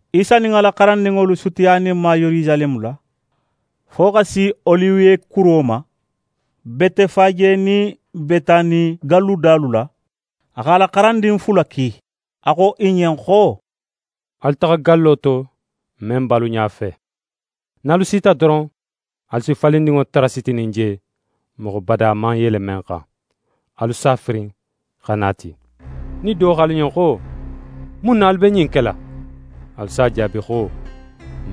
Isa nin a la xarandinŋolu sutiyaninma Yerusaleme la, fo xa si Oliwe kuro ma, Betefaje nin Betani galludalu la, a x'a la xarandin fula ki. A xo i ɲen xo: «Alu taxa gallo to, men be alu ɲafe. Nin alu sita doron, alu si falindinŋo tara sitinin je, moxo bada man yele men xan. Alu s'a firin xa na a ti. Nin do xo alu ɲen xo: “Mun na alu be ɲin kela?”, Alu s'a jaabi xo: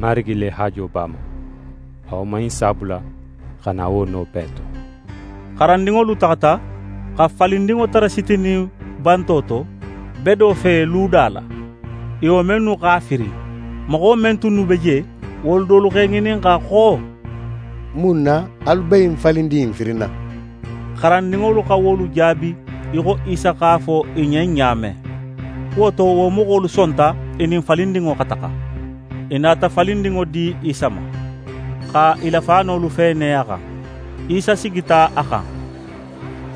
“Marigi le haajo be a ma.” A woman in si a bula xa na wo no bee to.» Xarandinŋolu taxata, xa falindinŋo tara sitinin banto to, bedo fe, luda la. I woman innu x'a firin. Moxo men tunnu be je, wolu dolu x'e ŋininxa xo: «Mun na alu be ɲin falindin in firinna?» Xarandinŋolu xa wolu jaabi í xo Isa x'a fo i ɲen ɲa men. Wo to, wo moxolu sonta i nin falindinŋo xa taxa. I nata falindinŋo di Isa ma, xa i la faanolu feene a xan. Isa sigita a xan.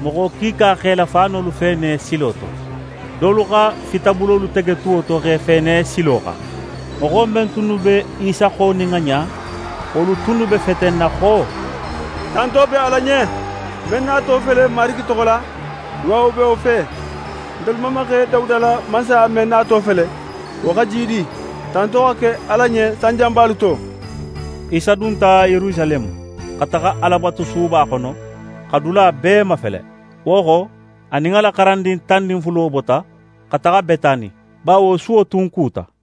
Moxo kiika x'e la faanolu feene silo to, dolu xa fitabulolu tege tuwo to, x'e feene silo xan. Moxo men tunnu be Isa xo nin a ɲa, wolu tunnu be fetenna xo: «Tanto be Ala ɲen! Men nato fele Marigi toxo la, duwawo be wo fe! Ntelu mamaxe Dawuda la mansaya men nato fele, wo xa jiidi! Tanto xa ke Ala ɲen sanjanbalu to!» Isa dunta Yerusaleme, xa taxa Alabatusuba xono, x'a dula bee mafele. Wo xo, a nin a la xarandin tan nin fulo bota, xa taxa Betani, bawo suwo tun kuta.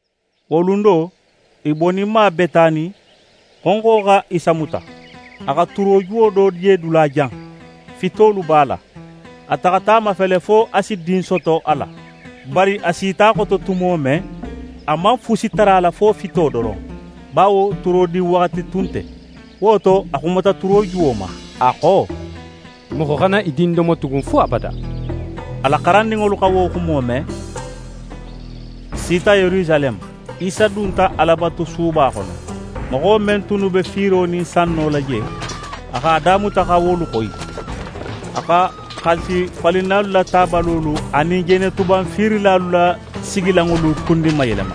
Wo lun do, i boninma Betani, xonxo xa Isa muta. A xa turojuwo do je dulajan, fitolu b'a la. A taxata a lafele fo a si din soto a la. Bari a sita a xoto tumo men, a man fusi tara a la, fo fito doron, bawo turodin waxati tun nte. Wo to, a xumata turojuwo ma, a xo: «Moxo xana í din domo tugun fo abada.» A la xarandinŋolu xa wo xumo me. I sita Yerusaleme, Isa dunta Alabatusuba xono. Moxo men tunnu be fiiro nin sanno la je, a x'a damuta xa wolu xoyi. A xa xaalisifalinnalu la tabalolu anin jenetuban fiirilalu la sigilanŋolu kundinmayelema.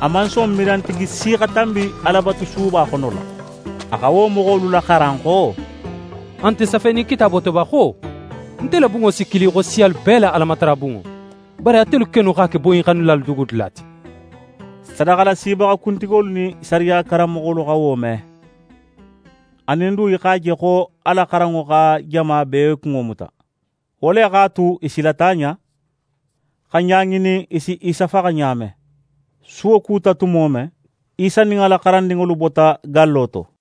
A man son mirantigi si xa tanbi Alabatusuba xono la. A xa wo moxolu laxaran xo: «A nte safenin Kitaabo to ba xo: “Nte la bunŋo si kili xo siyalu bee la Alamatarabunŋo”? Bari atelu kennu x'a ke boyinxannilalu dugudula ti.» Sadaxalasibaxa kuntigolu nin sariya karanmoxolu xa wo me; anin du, i x'a je xo a la xaranŋo xa jama bee kunŋo muta. Wo le x'a tu, i silata a ɲa, xa ɲa ŋinin, i si Isa faxa ɲa men. Suwo kuta tumo men, Isa nin a la xarandinŋolu bota gallo to.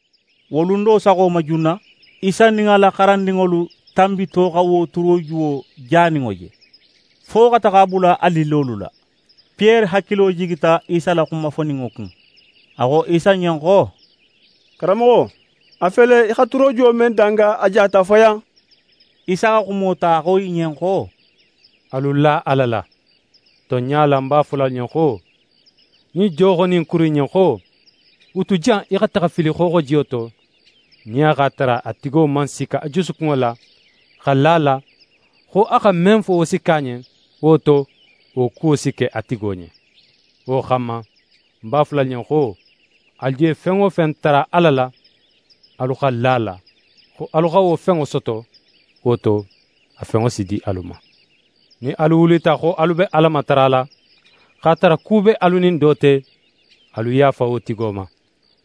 Wo lun do saxo ma junna, Isa nin a la xarandinŋolu tanbito xa wo turojuwo janinŋo je, fo xa taxa a bula a lillolu la. Piyere hakilo jigita Isa la xuma foninŋo kun, a xo Isa ɲen xo: «Karanmoxo, a fele í xa turojuwo men danga, a jata fayan.» Isa xa xumo ta, a xo i ɲen xo: «Alu la Ala la. Tonɲa la, ń b'a fola alu ɲen xo, nin do xo ɲin kuru in ɲen xo: “Wutu jan í xa taxa í fili xooxojiyo to,” nin a x'a tara a tigo man sikka a jusukunŋo la, xa la a la, xo a xa men fo, wo si ke a ɲen, wo to, wo kuwo si ke a tigo ɲen. Wo xanma, ń b'a fola alu ɲen xo, alu je fen wo fen tara Ala la, alu xa la a la, xo alu xa wo fenŋo soto; wo to, a fenŋo si di alu ma. «Nin alu wulita xo alu be Ala matarala, x'a tara ku be alu nin do te, alu yaafa wo tigo ma,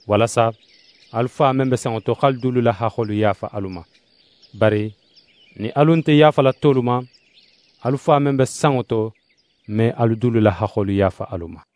walasa alu Fa men be sanŋo to, x'alu dulu la haxxolu yaafa alu ma. [ Bari nin alu nte yaafala tolu ma, alu Fa men be sanŋo to me alu dulu la haxxolu yaafa alu ma.]»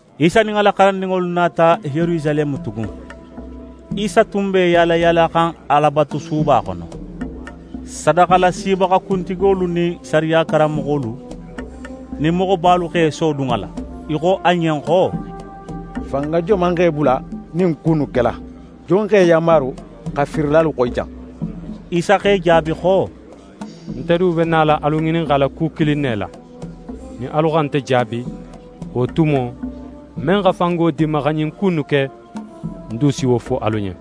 Isa nin a la xarandinŋolu nata Yerusaleme tugun. Isa tun be í yaalayaalaxan Alabatusuba xono. Sadaxalasibaxa kuntigolu nin sariya karanmoxolu nin moxobalu x'e sodun a la. I xo a ɲen xo: «Fanga joman x'é bula ɲin ku innu kela? Jon x'é yanmaru xa fiirilalu xoyi jan?» Isa x'e jaabi xo: «Nte du be nala alu ŋininxala ku kilin ne la. Nin alu xa nte jaabi, wo tumo, men xa fango di ń ma xa ɲin ku innu ke, ń du si wo fo alu ɲen.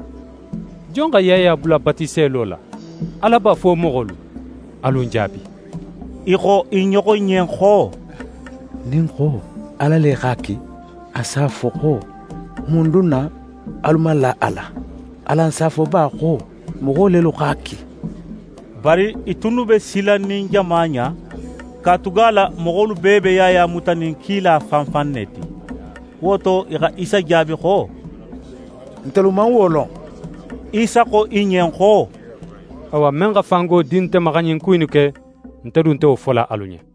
Jon xa Yaya bula batiselo la, Ala ba, fo moxolu? Alu ń jaabi!» I xo i ɲoxo ɲen xo: «Nin n xo: “Ala le x'a ki”, a s'a fo xo: “Mun dun na alu man la a la?” Alan s'a fo ba xo: “Moxo lelu x'a ki”?» Bari i tunnu be silanin jama ɲa, katugala moxolu bee be Yaya mutanin kila fan fan ne ti. Wo to, i xa Isa jaabi xo: «Ntelu man wo lon.» Isa xo i ɲen xo: «Awa, men xa fango di nte ma xa ɲin ku innu ke, nte du nte wo fola alu ɲen.»